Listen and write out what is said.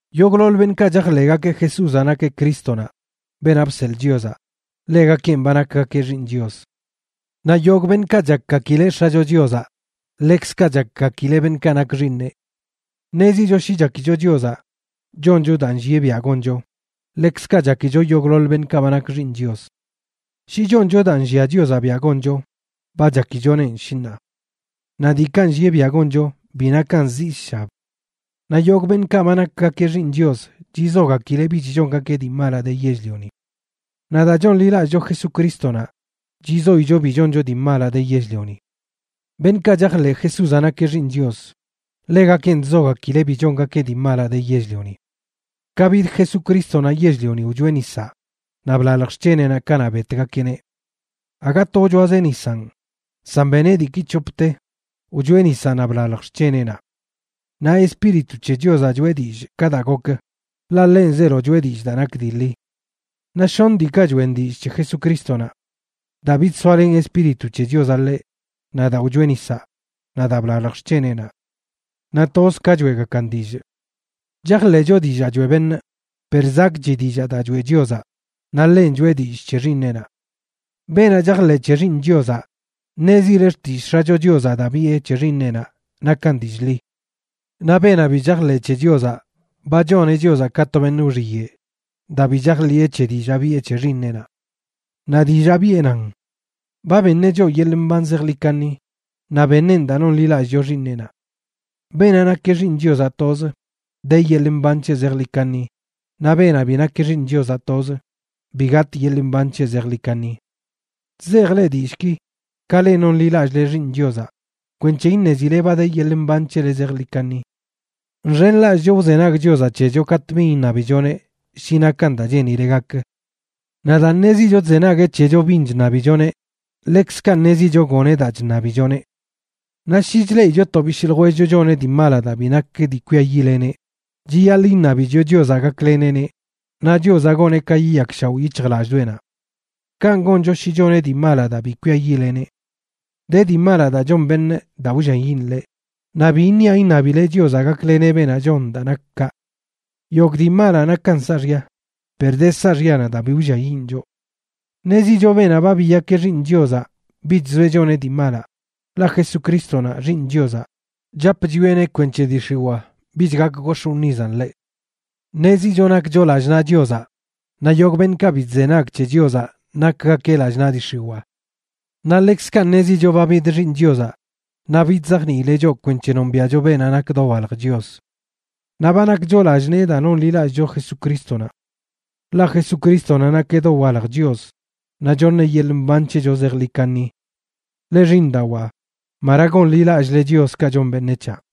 Yogꞌḻoḻ beṉꞌkaꞌ chajḻeꞌgakeꞌ Jesúzaꞌ nakeꞌ Crístonaꞌ, beenaꞌ bseḻꞌ Chiozaꞌ, ḻegakenꞌ ba nakgakeꞌ xiiṉ Chios. Naꞌ yogꞌ beṉꞌkaꞌ chakgakileꞌ X̱acho Chiozaꞌ ḻekzkaꞌ chakgakileꞌ beṉꞌkaꞌ nak xiiṉeꞌ. Ṉezicho shi chakicho Chiozaꞌ, choncho daa nllieꞌ biaꞌ goncho, ḻekzkaꞌ chakicho yogꞌḻoḻ beṉꞌkaꞌ ba nak xiiṉ Chios. Shi choncho daa nllia Chiozaꞌ biaꞌ goncho, ba chakichonenꞌ, shi ṉaa. Naꞌ diikaꞌ nllieꞌ biaꞌ goncho bi nakan zii sshab. Naꞌ yogꞌ beṉꞌkaꞌ ba nakgakeꞌ xiiṉ Chios chizogakileꞌ bich chongakeꞌ dii malaꞌ de yell-lioni. Naꞌ daa chonḻilallꞌcho Jesucrístonaꞌ, chizoicho bi choncho dii malaꞌ de yell-lioni. Beṉꞌkaꞌ chajḻeꞌ Jesúzaꞌ nakeꞌ Xiiṉ Chios, ḻegakenꞌ chzogakileꞌ bi chongakeꞌ dii malaꞌ de yell-lioni. Ka bid Jesucrístonaꞌ yell-lioni wchoeꞌ nisaꞌ naꞌ blalj xc̱heneꞌnaꞌ kanaꞌ betgakeꞌneꞌ. Aga to wchoazeꞌ nisanꞌ, san beneꞌ diiki c̱hopte, wchoeꞌ nisaꞌ naꞌ blalj xc̱heneꞌnaꞌ. Naꞌ Espíritu c̱he Chiozaꞌ choeꞌ dillꞌ ka daa gokə, ḻaꞌ ḻenꞌ zeelo choꞌe dillꞌ daa nak dii ḻi. Naꞌ shoṉ diikaꞌ choeꞌn dillꞌ c̱he Jesucrístonaꞌ: Daa bidsoalen Espíritu c̱he Chiozaꞌ ḻeꞌ, naꞌ daa wchoeꞌ nisaꞌ, naꞌ daa blalj xc̱heneꞌnaꞌ. Naꞌ toz ka choeꞌgakan dillꞌ. Chajḻeꞌcho dillaa choeꞌ beṉꞌ, per zakꞌchi dillaa daa choeꞌ Chiozaꞌ, naꞌ ḻenꞌ choꞌe dillꞌ c̱he Xiiṉeꞌnaꞌ. Beenaꞌ chajḻeꞌ c̱he Xiiṉ Chiozaꞌ, ṉezile xtillꞌ X̱acho Chiozaꞌ daa biꞌe c̱he Xiiṉeꞌnaꞌ nakan dillꞌ ḻi. Naꞌ beenaꞌ bi chajḻeꞌ c̱he Chiozaꞌ ba choneꞌ Chiozaꞌ ka to beṉꞌ wxiyeꞌ daa bi chajḻiꞌe c̱he dillaa biꞌe c̱he Xiiṉeꞌnaꞌ. Naꞌ dillaa biꞌe nan: ba beṉeꞌ choꞌ yeḻꞌ mban zejḻi kaṉi, naꞌ beṉeꞌn daa nonḻilallꞌcho Xiiṉeꞌnaꞌ. Beenaꞌ nakeꞌ Xiiṉ Chiozaꞌ tozə, de yeḻꞌ mban c̱heꞌ zejḻi kaṉi, naꞌ beenaꞌ bi nakeꞌ Xiiṉ Chiozaꞌ tozə, bi gatꞌ yeḻꞌ mban c̱heꞌ zejḻi kaṉi. Chzejꞌ leꞌ dillꞌki, ka leꞌ nonḻilallꞌle Xiiṉ Chiozaꞌ, kwenc̱he iṉezile ba de yeḻꞌ mban c̱hele zejḻi kaṉi. Nxenlallꞌcho wzenag Chiozaꞌ c̱hecho katꞌ bin iṉabichoneꞌ shi nakan daa cheenileꞌ gakə. Naꞌ daa ṉezicho chzenagueꞌ c̱hecho bin chṉabichoneꞌ, ḻekzkaꞌ ṉezicho goneꞌ daa chṉabichoneꞌ. Naꞌ shi chleꞌicho to bishꞌ ljwellcho choneꞌ dii malaꞌ daa bi nak dii kwiayiꞌleneꞌ, chiyaḻꞌ iṉabicho Chiozaꞌ gakleneꞌneꞌ, naꞌ Chiozaꞌ goneꞌ ka yiyakshaoꞌ yic̱hjlallꞌdoꞌenaꞌ. Kanꞌ goncho shi choneꞌ dii malaꞌ daa bi kwiayiꞌleneꞌ. De dii malaꞌ daa chon beṉꞌ daa wlliayiꞌn ḻeꞌ, naꞌ bi niaꞌ iṉabile Chiozaꞌ gakleneꞌ beenaꞌ chon daa nak kaꞌ. Yogꞌ dii malaꞌ nakan saaxya, per de saaxyanaꞌ daa bi wlliayiꞌn choꞌ. Ṉezicho beenaꞌ ba biyak xiiṉ Chiozaꞌ bich zoeꞌ choneꞌ dii malaꞌ, ḻaꞌ Jesucrístonaꞌ, Xiiṉ Chiozaꞌ, chap chwieꞌneꞌ kwenc̱he dii x̱iwaa bich gak gox̱ꞌ wṉizan ḻeꞌ. Ṉezicho nakcho lallꞌ naꞌ Chiozaꞌ, naꞌ yogꞌ beṉꞌkaꞌ bi chzenag c̱he Chiozaꞌ nakgakeꞌ lallꞌ naꞌ dii x̱iwaa. Naꞌ ḻekzkaꞌ ṉezicho ba bid Xiiṉ Chiozaꞌ naꞌ bidzajniileꞌ choꞌ kwenc̱he nombiaꞌcho beenaꞌ nak dowalj Chios. Naꞌ ba nakcho lallꞌ nee daa nonḻilallꞌcho Jesucrístonaꞌ. Ḻaꞌ Jesucrístonaꞌ nakeꞌ dowalj Chios, naꞌ choṉeꞌ yeḻꞌ mban c̱hecho zejḻi kaṉi. Leꞌ xiiṉdawaa, mara gonḻilallꞌle chioskaꞌ chon beṉec̱haꞌ.